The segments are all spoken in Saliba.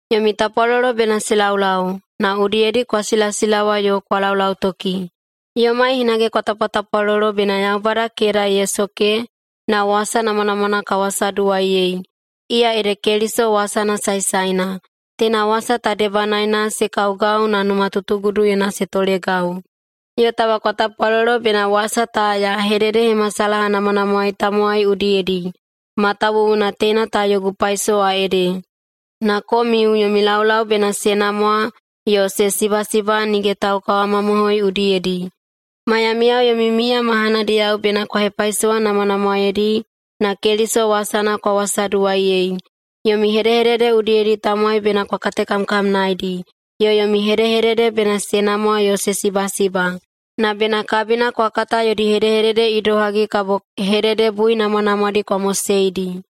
Yomi tapwalolo bena se laulau, na udiyedi kwa silasilawa yo kwa laulautoki. Yomai hinage kwa tapwatapwalolo bena Yaubada keda ye soke na wasa namwanamwana ka wasaduwaiyei, iya ede Keliso wasana saesaena. Teina wasa ta debanaena se kaugau na numatutuguduyena se tolegau. Yo taba kwa tapwalolo bena wasa ta ya hededehemasalahanamwanamwaei tamowai udiyedi, matawuwuna teina ta yogu paisowa ede. Na komiu, yomi laulau bena se namwa yo se sibasiba nige taukawamamohoi udiyedi. Maiyamiyao yomi miya mahanadiyao bena kwa hepaisowanamwanamwaedi na Keliso wasana kwa wasaduwaiyei. Yomi hedehedede udiyedi tamowai bena kwa katekamkamnaedi, yo yomi hedehedede bena se namwa yo se sibasiba. Na bena kabina kwa kata yodi hedehedede idohagi kabo hededebuinamwanamwaedi kwa moseidi.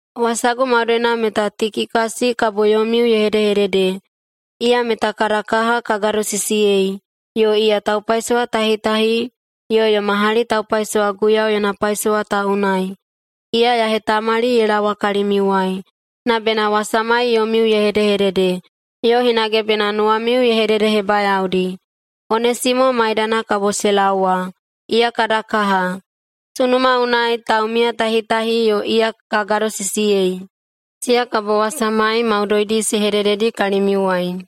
Wasagu maudoina meta Tikikasi kabo yomiu ye hedehedede. Iya meta kada kaha ka gadosisiyei, yo iya taupaisowatahitahi yo yoma hali taupaisowa Guiyau yona paisowa ta unai. Iya ya hetamali ye laowa kalimiuwai, na bena wasamai yomiu ye hedehedede, yo hinage bena nuwamiu ye hededehebayaodi. Onesimo maidana kabo se laowa. Iya kada kaha, sunuma unai taumiyatahitahi yo iya ka gadosisiyei. Siya kabo wasamai maudoidi se hedededi kalimiuwai.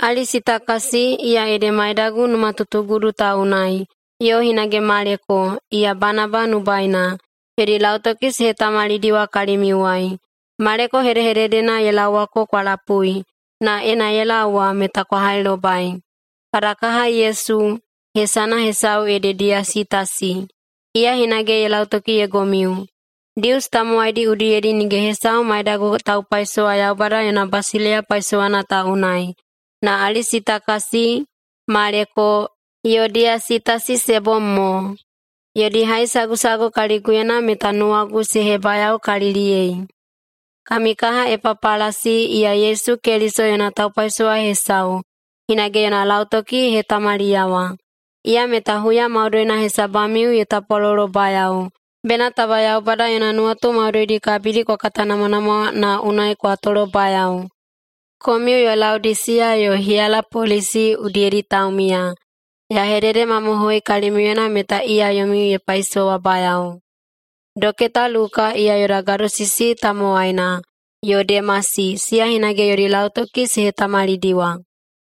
Alisitakasi, iya ede maidagu numatutugudu ta unai, yo hinage Maleko, iya Banaba nubaina, yodi lautoki se hetamalidiwa kalimiuwai. Maleko hedehededena ye laowako kwa lapui, na ena ye laowa meta kwa hailobai. Kada kaha Yesu, hesana hesau ede Diyasitasi, iya hinage ye lautokiyeigomiu. Dius tamowaidi udiyedi nige hesau maidagu taupaisowa Yaubada yona basileiya paisowana ta unai, na Alisitakasi, Maleko, yo Diyasitasi se bom mo. Yodi haisagusagu kaliguyena meta nuwagu se hebayaokaliliyei. Kami kaha Epapalasi, iya Yesu Keliso yona taupaisowa hesau, hinage yona lautoki ye hetamaliyawa. Iya meta huya maudoina hesabamiu ye tapwalolobayao, bena taba Yaubada yona nuwatu maudoidi kabidi kwa katanamwanamwa na unai kwa tolobayao. Komiu yo Laodisiya yo Hiyalapolisi udiyedi taumiya, ya hededemamohoi kalimiuyena meta iya yomiu ye paisowabayao. Doketa Luka, iya yoda gadosisi tamowaina, yo Demasi, siya hinage yodi lautoki se hetamalidiwa.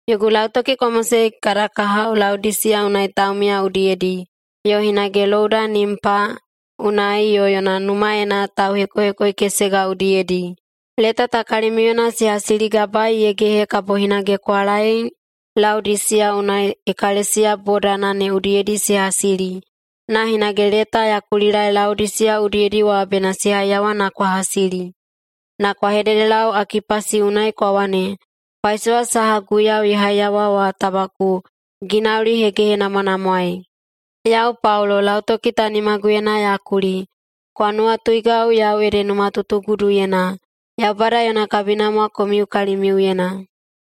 Yogu lautoki kwa mosei kada kahao Laodisiya unai taumiya udiyedi, yo hinage louda Nimpa unai yo yona numaena tauhekohekoikesega udiyedi. Leta ta kalimiuyena se hasiligabaei ye gehe kabo hinage kwa laei Laodisiya unai ekalesiya bodana ne udiyedi se hasili, na hinage leta ya kulilaei Laodisiya udiyedi wa bena se haiyawa na kwa hasili. Na kwa hededelau Akipasi unai kwa wane, “Paisowa saha Guiyau ye haiyawa wa taba ku ginaulihegehenamwanamwaei!” Yau Paulo, lautoki ta yau nimaguyena ya kuli. Kwa nuwatuigau yau ede numatutuguduyena. Yaubada yona kabinamwa komiu kalimiuyena!